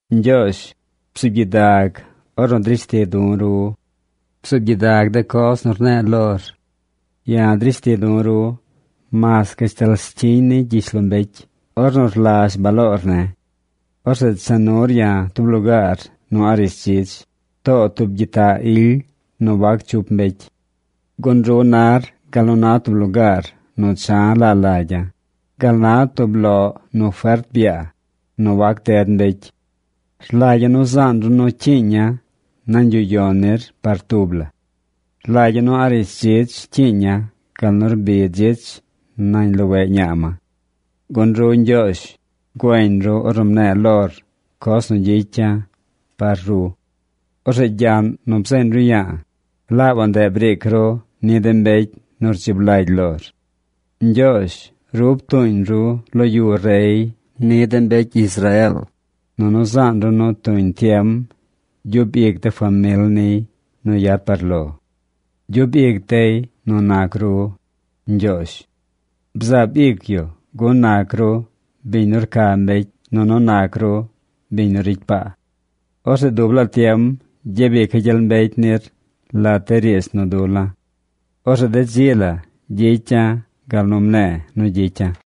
Ñgyoozh, bzuub gyidag ornu drish ti̱ du̱ ru. Bzuub gyidag de coz nu rne̱e̱ lor. Ya̱ drish ti̱ du̱ ru mas gashtal scyiñ ni gyishlombecy ornu rlazh baloor ne̱. Orzeꞌ cha nur ya̱ tub lugaar nu a̱ꞌ rishdzidz, too tub gyitaꞌ ily nu wac chup mbecy. Gun ru nar gal nu na tub lugaar nu cha̱ laa lagya̱, gal na tub loꞌ nu fert byaa, nu wac ded mbecy. Rlagya̱ nu zaan ru nu cyiiña̱ nañ yuꞌ yon nir par tub la. Rlagya̱ nu a̱ꞌ rishdzidz cyiiña̱ gal nu rbi dzich nañ loweꞌ ñaa ma. Gun ru Ñgyoozh, güeñ ru ornu mne̱e̱ lor coz nu gyicya̱ par ru. Orzeꞌ gyaꞌn nu bzeeñ ru ya̱a̱, laabaꞌ ndeꞌ briic ru ni de mbecy nu rdzib lagy lor. Ñgyoozh ru ptuuñ lo yu rey ni de mbecy Israeel, nunu zaan ru nu tuñ tiem gyub ic de famil niy nu yad par lo. Gyub ic dey nu nac ru, Ñgyoozh. Bzaab ic yu gun nac ru biñ nu rca mbecy nunu nac ru biñ nu ricy paa. Orzeꞌ dub laa tiem gyabica̱ gyel mbecy nir lat de riidz nu dula̱. Orzeꞌ de dzi la gyicya̱ gal nu mne̱e̱ nu gyicya̱.